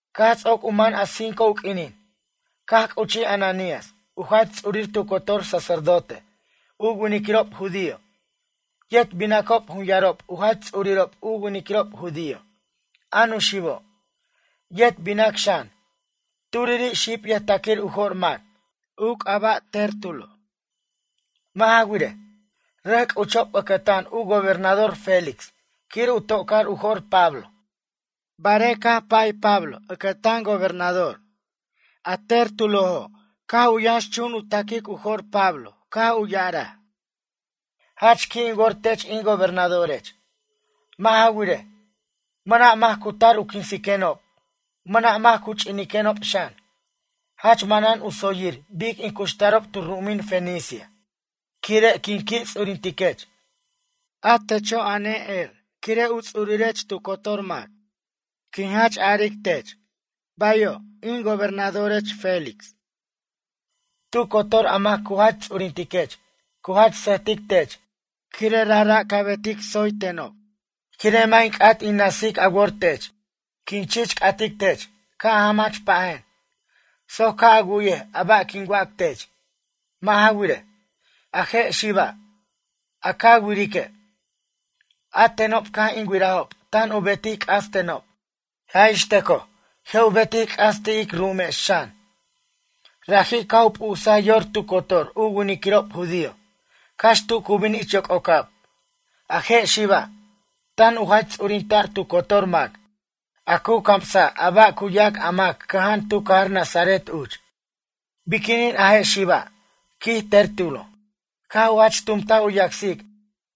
Caj ts'oc u man cinco u q'uinin, caj c'uchij Ananías u jach ts'urir tu cotor sacerdote u winiquirob judío, yet binacob jun yarob u jach ts'urirob u winiquirob judío, a nuxibo', yet binac xan, turiri' xib yʌjtaquir u jo'r mac, u c'aba' Tértulo. Mʌ' ja wirej, rʌc c'uchob ʌcʌtan u gobernador Félix quir u to'car u jo'r Pablo. Barej, caj pa'y Pablo ʌcʌtan gobernador a Tértulo caj u yʌnxchun u ta'quic u jo'r Pablo caj u ya'araj: ―Jach qui' in wor tech in gobernadorech. Mʌ' ja wirej, mʌna' mac cu tar u quinsiquenob mʌna' mac cu chuquiquenob xan. Jach manan u tsoyir bic in cuxtarob tu ru'umin Fenicia quire' quin qui' ts'urintiquech. A techo' a ne'er quire' a ts'urech tu cotor mac. Quin jach aric tech: “Bayo', in gobernadorech Félix.” Tu cotor mac a cu jach ts'urintiquech cu jach sʌjtic tech quire' rajra' ca betic tsoy tenob. Quire' mʌ' in c'at in na'sic a wor tech, quin chich c'atic tech ca' a jamach pajen, soc ca' a wu'yej a ba' quin wac tech. Mʌ' ja wirej, a je' xiba', a ca wirique', a tenob caj in wirajob tan u betic c'as tenob, ja' ix tʌcoj je' u betic c'as ti' ic ru'umex xan. Raji' caj u p'usaj yor tu cotor u winiquirob judío cax tu cu bin ich yoc'ocab. A je' xiba', tan u jach ts'urinta'r tu cotor mac a cu camsa' a ba' cu yac a mac cʌja'an tu cajar Nazaret uch. Biquinin a je' xiba' ―quij Tértulo―, caj u jach tumtaj u yacsic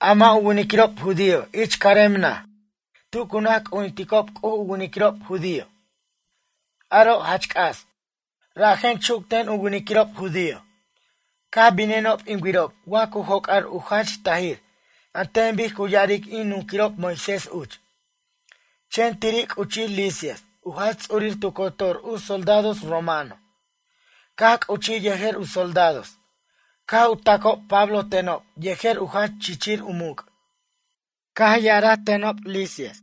a mʌ' u winiquirob judío ich carem naj tu cu naj c'ujinticob C'uj u winiquirob judío, aro' jach c'as, rajen chuc ten u winiquirob judío. Caj binenob in wirob wa cu joc'ar u jach tajir an ten bic cu ya'aric in nunquirob Moisés uch. Chen tiri' c'uchij Lisias u jach ts'urir tu cotor u soldados romano, caj c'uchij yejer u soldados caj u tacob Pablo tenob yejer u jach chichir u muc'. Ya'araj tenob Lisias: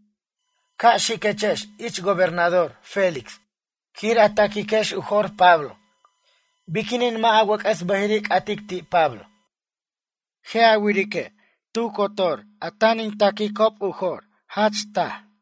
“Ca' xiquechex ich gobernador Félix quir a taquiquex u jo'r Pablo.” Biquinin mʌ' a wʌc'ʌs bʌjiri' c'atic ti' Pablo? Je' a wirique' tu cotor a tan in taquicob u jo'r, jach tu taje'.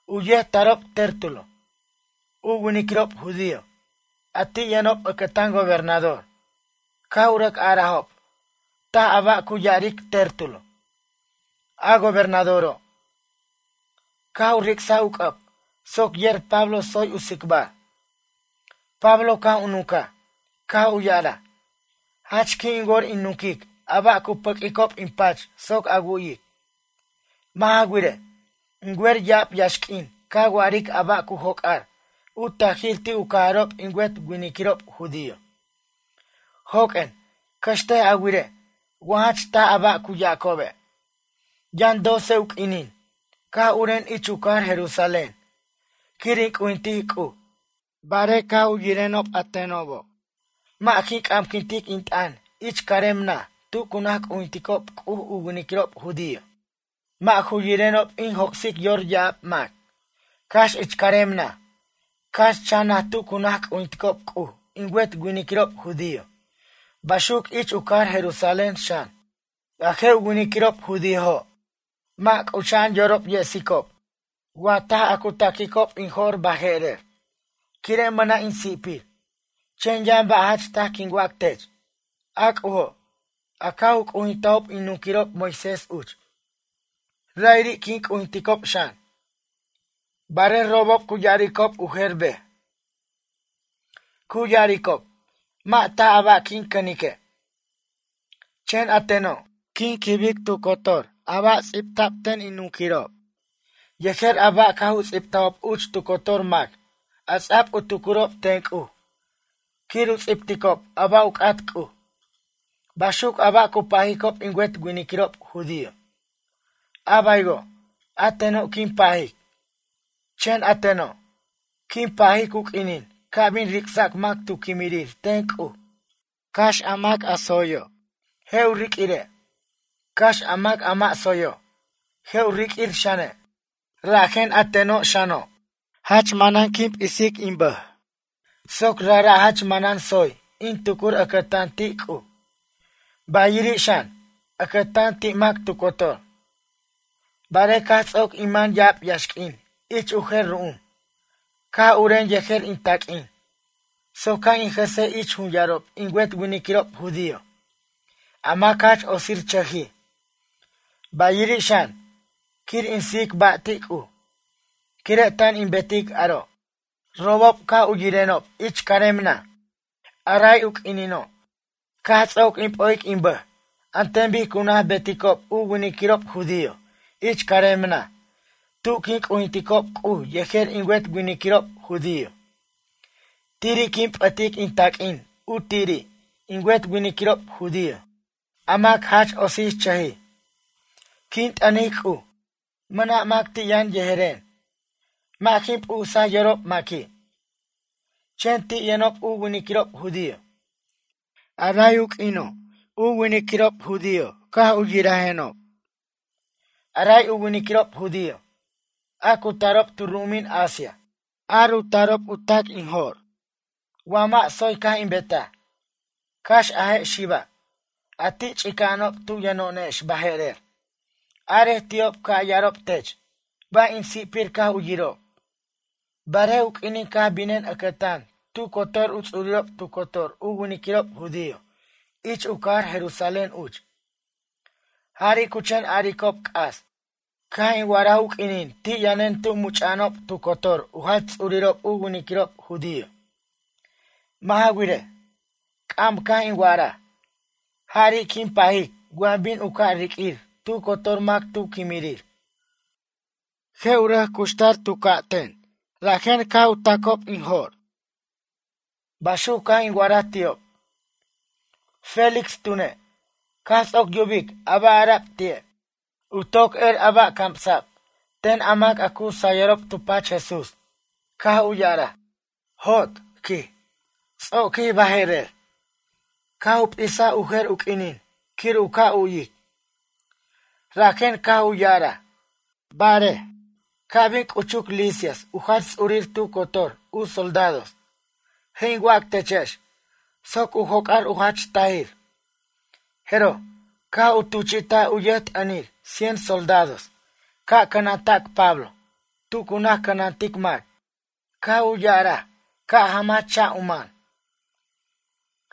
U yet tarob Tértulo, u winiquirob judío, a ti' yʌnob ʌcʌtan gobernador, caj u rʌc arajob taj a ba' cu ya'aric Tértulo. A gobernadoro', caj u ric'saj u c'ʌb soc yer Pablo tsoy u tsicbar. Pablo caj u nuncaj, caj u ya'araj: ―Jach qui' in wor in nunquic a ba' cu pʌq'uicob in pach soc a wu'yic. Mʌ' ja wirej, in wer ya'ab yaxq'uin ca wa'aric a ba' cu joc'ar u tajir ti' u cajarob in wet winiquirob judío. Joq'uen, cʌxtej a wirej wa jach taj a ba' cu yacobe'. Yʌn doce u q'uinin caj uren ich u cajar Jerusalén quir in c'ujintic C'uj. Barej caj u yirenob a tenobo', mʌ' jin c'amquintic in t'ʌn ich carem naj tu cu naj c'ujinticob C'uj u winiquirob judío mʌ' ju yirenob in joc'sic yor ya'ab mac, cax ich carem naj, cax chan naj tu cu naj c'ujinticob C'uj in wet winiquirob judío baxuc ich u cajar Jerusalén xan. A je' u winiquirob judíojo' mʌ' c'ucha'an yorob yesicob wa taj a cu taquicob in jo'r baje'rer, quire' mʌna' in si'pir. Chen yʌn ba' jach taj quin wac tech. A C'ujo', a caj u c'ujintajob in nunquirob Moisés uch, ra'iri' quin c'ujinticob xan. Barej robob cu ya'aricob u jer bej. Cu ya'aricob mʌ' taj a ba' quin cʌnique'. Chen a teno', quin quibic tu cotor a ba' ts'ibta'b ten in nunquirob, yejer a ba' caj u ts'ibtajob uch tu cotor mac a ts'a'b u tucurob ten C'uj quir u ts'ibticob a ba' u c'at C'uj. Baxuc a ba' cu pajicob in wet winiquirob judío, a baywo' a teno' quin pajic. Chen a teno', quin pajic u q'uinin ca' bin ric'sac mac tu quimirir ten C'uj, cax a mac a tsoyo', je' u riq'uire', cax a mac a mʌ' tsoyo', je' u riq'uir xane'. Rajen a ten xano', jach manan quin p'isic in bʌj soc rajra' jach manan tsoy in tucur ʌcʌtan ti' C'uj, bayiri' xan, ʌcʌtan ti' mac tu cotor. Barej caj ts'oc in man ya'ab yaxq'uin ich u jer ru'um, caj uren yejer in taq'uin soc ca' in jʌsej ich jun yarob in wet winiquirob judío a mac jach otsirchʌjij, bayiri' xan, quir in sijic ba' ti' C'uj. Quire' tan in betic aro', robob caj u yirenob ich carem naj a rey u q'uinino', caj ts'oc in p'o'ic in bʌj an ten bic cu naj beticob u winiquirob judío ich carem naj tu quin c'ujinticob C'uj yejer in wet winiquirob judío. Tiri' quin p'ʌtic in taq'uin u tiri' in wet winiquirob judío a mac jach otsichʌjij. Quin t'ʌnic C'uj, mʌna' mac ti' yʌn yejeren. Mʌ' jin p'usaj yorob maqui'. Chen ti' yʌnob u winiquirob judío, a ray u q'uino' u winiquirob judío caj u yirajenob. A ray u winiquirob judío, a cu tarob tu ru'umin Asia, ar u tarob u tac in jo'r, wa mʌ' tsoy caj in betaj. Cax a je' xiba', a ti' ch'ica'anob tu yʌno'onex baje'rer, arej ti'ob ca' ya'arob tech ba' in si'pir caj u yirob, barej u q'uinin caj binen ʌcʌtan tu cotor u ts'urirob tu cotor u winiquirob judío ich u cajar Jerusalén uch. Jari' cu chen aricob c'as caj in wa'araj u q'uinin ti' yʌnen tu much'a'anob tu cotor u jach ts'urirob u winiquirob judío. Mʌ' ja wirej, c'am caj in wa'araj: “Jari' quin pajic wa bin u ca' riq'uir tu cotor mac tu quimirir. Je' u rʌc cuxtar tu ca'ten, rajen caj u tacob in jo'r.” Baxuc caj in wa'araj ti'ob. Félix tune', caj ts'oc yubic a ba' ara'b ti'e'. U toc er a ba' camsa'b ten a mac a cu sayʌrob tu pach Jesús. Caj u ya'araj: ―Jot ―quij―, ts'oquij baje'rer. Caj u p'isaj u jer u q'uinin quir u ca' u'wic, rajen caj u ya'araj: ―Barej, ca' bin c'uchuc Lisias u jach ts'urir tu cotor u soldados, je' in wac techex soc u joc'ar u jach tajir. Jeroj, caj u tuchi'taj u yʌjt'ʌnir cien soldados ca' cʌnanta'c Pablo tu cu naj cʌnantic mac. Caj u ya'araj ca' jamach cha' u man.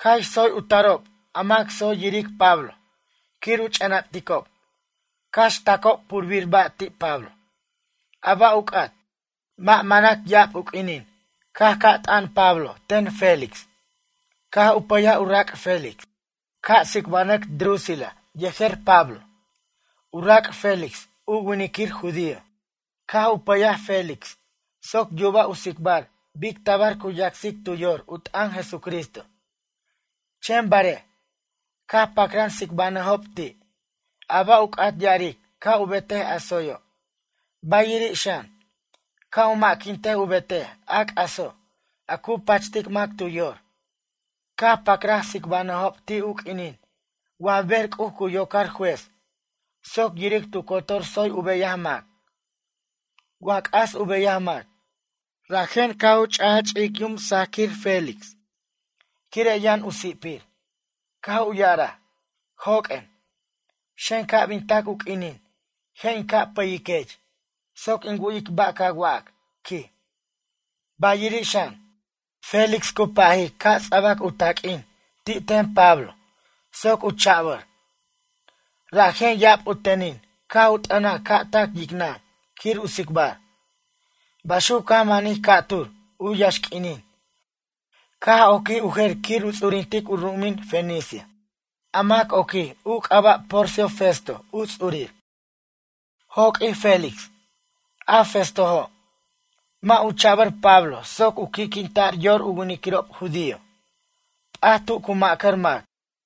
Cax tsoy u tarob a mac tsoy yiric Pablo quir u ch'enapticob, cax tacob purbir ba' ti' Pablo, a ba' u c'at. Mʌ' manʌc ya'ab u q'uinin caj ca' t'an Pablo ten Félix. Caj u pʌyaj u rac' Félix ca' tsicbanʌc Drusila yejer Pablo. U rac' Félix u winiquir judío. Caj u pʌyaj Félix soc yuba' u tsicbar bic tabar cu yacsic tu yor u t'ʌn Jesucristo. Chen barej, caj pacran tsicbanʌjob ti', a ba' u c'at ya'aric ca' u betej a tsoyo', bayiri' xan, ca' u ma'quintej u betej a c'aso' a cu pachtic mac tu yor. Caj pacraj tsicbanʌjob ti' u q'uinin wa ber C'uj cu yocar juez soc yiric tu cotor tsoy u beyaj mac, wa c'as u beyaj mac. Rajen caj u ch'aj ch'ic yum sajaquir Félix, quire' yʌn u si'pir, caj u ya'araj: ―Joq'uen, xen ca' bin tac u q'uinin je' in ca' pʌyiquech soc in wu'yic ba' ca wac ―quij. Bayiri' xan, Félix cu pajic ca' ts'abac u taq'uin ti' ten Pablo soc u cha'bar. Rajen ya'ab u tenin caj u t'ʌnaj ca' tac yicnʌn quir u tsicbar. Baxuc caj manij ca'tur u yaxq'uinin caj oquij u jer quir u ts'urintic u ru'umin Fenicia. A mac oquij u c'aba' Porcio Festo u ts'urir. Joq'uij Félix. A Festojo', mʌ' u cha'bʌr Pablo soc u qui'quinta'r yor u winiquirob judío. P'at tu cu ma'cʌr mac.